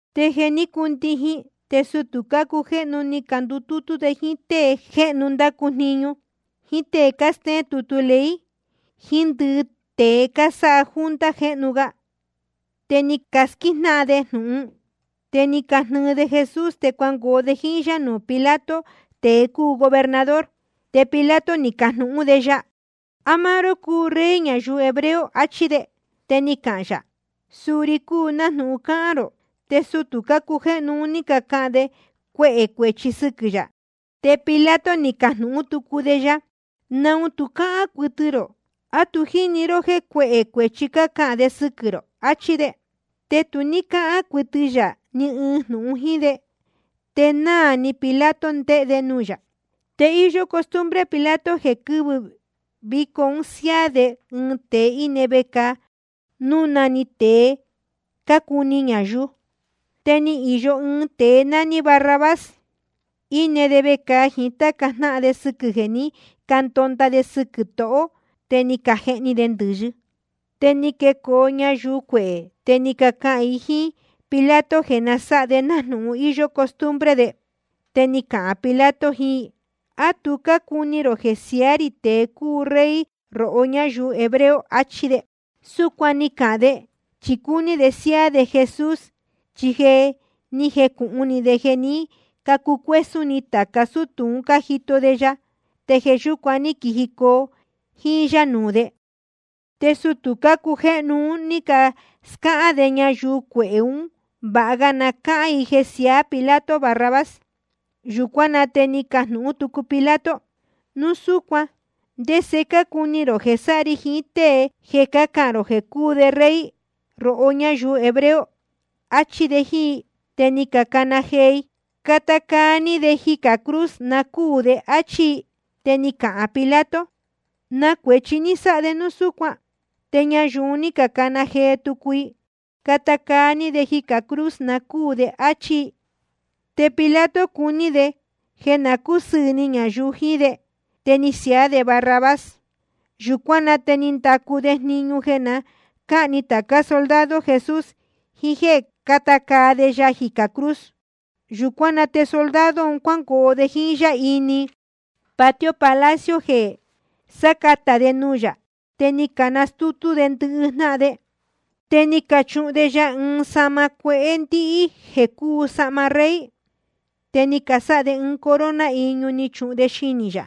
Te jeē ní cundijin, te sutū cácujéhnu ni candutútú de jíín tée jéhnu cándacu jniñu, jíín tée cástéén tutu ley, jiín ndɨhɨ tēe cásáha junta cujéhnu ga, te ni casquíjnáhan de jnūhun. Te ni cajihni de Jesús, te cuangoo de jíín yá nuū Pilato, tēe cúu gobernador. Te Pilato ni cajnūhún de ya: ¿A máá ró cúu Rey ñayuu hebreo? achí de. Te ni cahān yā: Suu ri cúu, nájnūhun cáhán rō. Te sutū cácujéhnu un ní cacahān de cuehē cuēchi sɨquɨ̄ yā. Te Pilato ni cajnūhún tucu de ya: ¿Naun tu cáhán cuɨtɨ rō? ¿A tu jíni ró jéē cuehē cuēchi cácahān de sɨquɨ̄ rō? achí de. Te tu ní cáhán cuɨtɨ yā ni ɨɨn jnūhun jíín de. Te nahán ní naa ni Pilato ndéhé de nuū yā. Te íyó costumbre Pilato jeē quɨvɨ̄ víco un siáá de ɨɨn tēe íne vecāa, núu na‑ni tēe cácuni ñayuu. Te íyó ɨɨn tēe nání Barrabás, íne de vecāa jíín táca jnáhan de sɨquɨ̄ jeē ní candonda de sɨquɨ̄ tohō te ni cajehni de ndɨ̄yɨ. Te ni quecoo ñayuu cuehē, te ni cacahān i jíín Pilato jeē na sáha de nájnūhun íyó costumbre de. Te ni cahān Pilato jiín i: ¿A tu cácuni rō jeē siaá rī tēe cúu Rey rohó ñáyuu hebreo? achí de. Súcuan ni cahān de, chi cúní de siáá de Jesús. Chi je ni jecūhun ni de jeē ní cacucuésún ni tāca sútū un cájito de ya, te jeē yúcuan ní quijicoo jíín yá nuū de. Te sutū cácujéhnu un ní cascáhán de ñayuu cuehē un jéē váha ga na cácán i jeē siaá Pilato Barrabás. Yūcuán na te ni cajnūhún tucu Pilato: Núu súcuan ¿te ndese cácuni rō jeē sáha ri jiín tée jeē cácahān rō jeē cúu de Rey rohó ñáyuu hebreo? áchí de jíín i. Te ni cacana jee i: Cata caa ní de jicā cruz, na cúū de, áchí i. Te ni cahān Pilato: ¿Na cuēchi ni sáha de núu súcuan? Te ñayuu un ní cacana jee tucu i: Cata caa ní de jicā cruz, na cúū de, áchí i. Te Pilato cuní de jeē na cúsɨɨ̄ ni ñayuu jiín de, te ni siaá de Barrabás. Yūcuán na te ni ndacu de jniñu jeē na cáni tācá soldado Jesús, jiín jéē cata caa de ya jicā cruz. Yūcuán na te soldado un cuángoo de jíín yá ini patio palacio, jeē sácatā de nuū yā. Te ni canastútú de ndɨhɨ jnáhan de. Te ni cachuhun de ya ɨɨn sahma cuehé ndíhí jéē cúu sahma rey. Te ni casáha de ɨɨn corona iñu, ni cachuhun de xinī yā.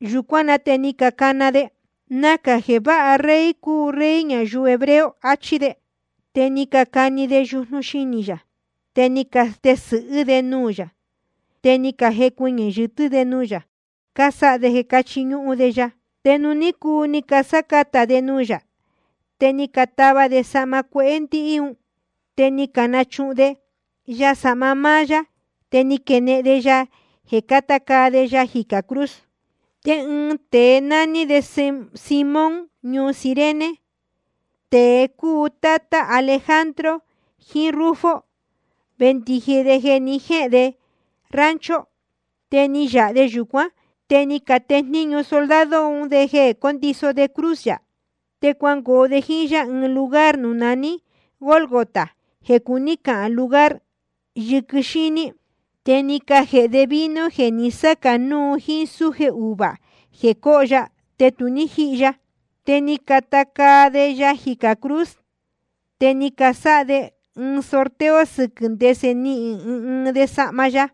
Yūcuán na te ni cacana de: Nacā jeē váha rey cúu Rey ñayuu hebreo, achí de. Te ni cacani de yujnu xinī yā, te ni catesɨ̄hɨ́ de nuū yā, te ni cajecuɨñɨ̄ yɨtɨ́ de nuū yā, casáha de jeē chiñúhún de ya. Te nuū ní cuu ni casácatā de nuū yā, te ni catava de sahma cuehé ndíhí un, te ni canachuhun de ya sahma máá yá. Te ni caquenehen de ya jeē cata caa de ya jicā cruz. Te ɨɨn tēe nání Simón ñuu Cirene, tēe cúu tátá Alejandro jiín Rufo, vendiji de jeē ni jéhēn de rancho. Te ni yāha de yūcuán, te ni catejníñu soldado un de jeē cóndiso de cruz yā. Te cuangoo de jíín yá ɨɨn lugar nuū naní Gólgota, jeē cuní cahān Lugar Yɨquɨ Xíní. Te ni cajēhe de vino jeē ni sácā núu jíín súje uvuā jeē cóho ya, te tu ní jíhi ya. Te ni cacata caa de ya jicā cruz. Te ni casáha de sorteo jeē sɨquɨ́ ndese nihīn ɨɨn ɨɨn de sahma ya.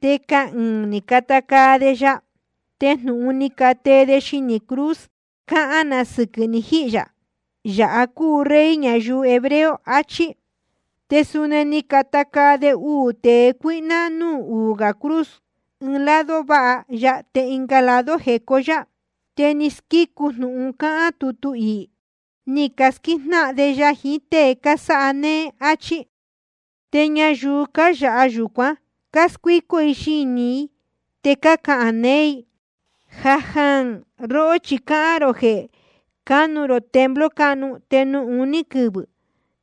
Te cahɨɨ̄n ni cacata caa de ya. Te jnūhun ni catee de xinī cruz cahán na sɨquɨ̄ ni jihī yā: Yāha cúu Rey ñayuu hebreo, achí. Te suni ni cacata caa de uū tēe cuíhná núū uū gā cruz, ɨɨn de lado váha ya, te ɨnga de lado jecó yá. Te ni squícu jnūhun cáhán tutu iī: Ni casquíjnáhan de ya jiín tée cásáha néé, áchí. Te ñayuu cáyāha yūcuán cáscuícó i xinī i, te cácahān neé i: Jājaān. Róhó chi cáhán rō jeē cánu rō templo cáhnu, te nuū uní quɨvɨ̄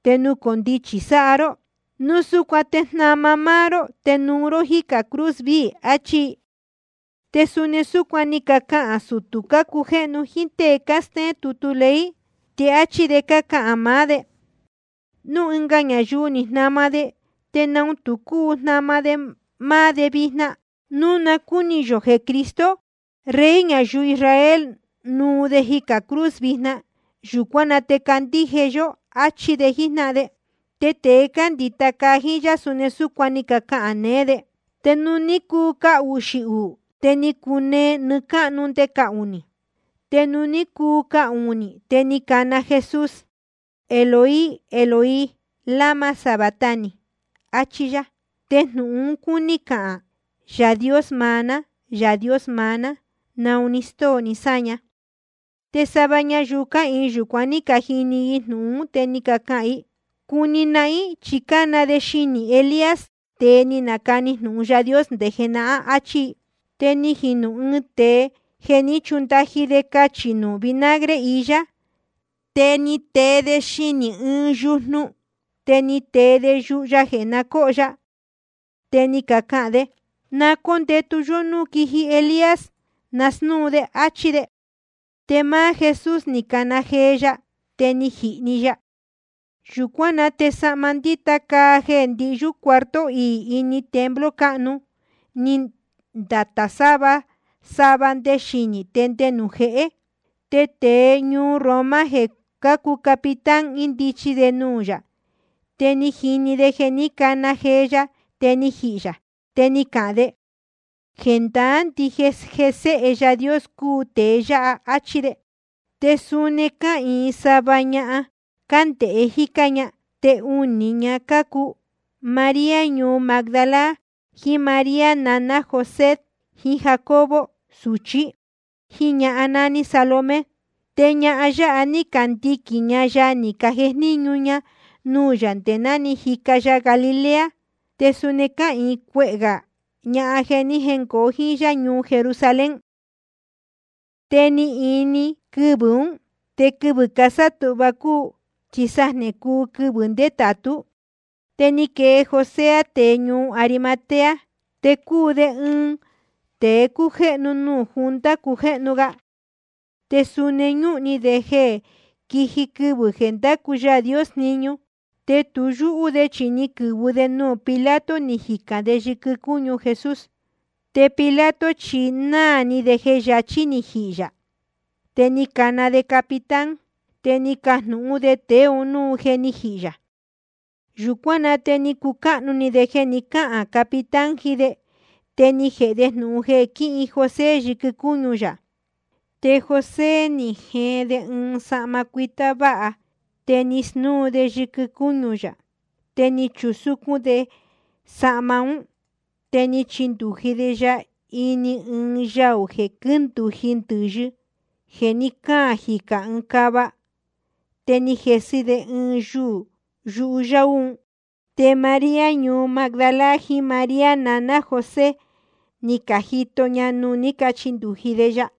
te nucondichi sáha ró. Núu súcuan te jnama ró máá ró, te nuu ró jícā cruz viī, achí i. Te suni súcuan ni cacahān catá sutū cácujéhnu jíín tée cástéén tutu ley, te áchí de cácahān maá de: Núu ɨnga ñayuu ni jnama de, ¿te naun tu cúu jnama de máá de vijna? Núu na cúni yō jeē Cristo, Rey ñayuu Israel, nuu de jicā cruz vijna, yūcuán na te candíje yó, áchí de jíjnáhan de. Te tēe cándita caa jíín yá, suni súcuan ni cacahān neé de. Te nuū ní cuu cahuxī uū, te ni cunee nɨɨ́ cáhnu nde cahunī. Te nuū ní cuu cahunī, te ni cana jee Jesús: Eloi, Eloi, ¿lama sabactani? achí yá. Te jnūhun un cúní cahān: Yaā Dios maá ná, Yaā Dios maá ná, ¿naun ni stóo ní sáña? Te sava ñayuu cáhīin yūcuan, ní cajini i jnūhun ún, te ni cacahān i: Cuni nahín, chi cána de xinī Elías, tēe ni nacani jnūhun Yaā Dios jenahán, achí i. Te ni jinu ɨɨn tēe, ni jechundaji de cachī nuū vinagre iyá. Te ni tee de xinī ɨɨn yujnu, te ni tee de yuhu ya jeē cóho ya. Te ni cahān de: Na cóndēhe yó núu quiji Elías nasnúu de, áchí de. Te máá Jesús ni cana jee ya, te ni jihī‑ni ya. Yūcuán na te sahma ndíta caa jeē ndihyú cuarto iī ini templo cáhnu, ni ndatā sava sava nde xinī te nde nuū jehé. Te tēe ñuu Roma jeē cúu capitán, índichi de nuū yā, te ni jini de jeē ní cana jee ya te ni jihī yā. Te ni cahān de: Jendaá ndije jeē Séhe Yaā Dios cúu tēe yáha, áchí de. Te suni cáhīin sava ñahan, cándēhe jícá ña. Te unī ña cácuu María ñuu Magdala, jiín María naná José jiín Jacobo suchí, jíín ñahan nání Salomé. Te ñahan yáha ní candiquīn ña ya, ni cajejníñu ña nuū yā nde náa jíca ya Galilea. Te suni cáhīin cuehē gā ñahan jeē ni jéngoo jíín yá ñuu Jerusalén. Te ni ini quɨvɨ̄ ún. Te quɨvɨ̄ sátūhva cúu, chi sajnē cúu quɨvɨ̄ ndétātú. Te ni quee José, tēe ñuu Arimatea. Te cúu de ɨɨn tēe cújéhnu nuū junta cujéhnu ga. Te suni ñúhun ni de jeē quiji quɨvɨ̄ jeē ndacu Yaā Dios jniñu. Te tu yúhú de chi ni quɨ̄vɨ de nuū Pilato, ni jicān de yɨquɨ cúñu Jesús. Te Pilato chi náā ni de jeē yachí ni jihī yā. Te ni cana de capitán, te ni cajnūhún de tēe un núu je ni jihī yā. Yūcuán na te ni cucáhnu ni de jeē ni cáhān capitán jiín de, te ni jēhe de jnūhun jeē quihin José yɨquɨ cúñu yā. Te José ni jeen de ɨɨn sahma cuitá váha. Te ni snúu de yɨquɨ cúñu yā, te ni chusúcún de sahma ún. Te ni chindūji de ya ini ɨɨn yaū jeē quíndūji ndɨ̄yɨ, jeē ní caan jicā ɨɨn cava. Te ni jesɨ de ɨɨn yuū yuhu yáú un. Te María ñuu Magdala, jiín María naná José, ni cajito ña nuū ní cachindūji de ya.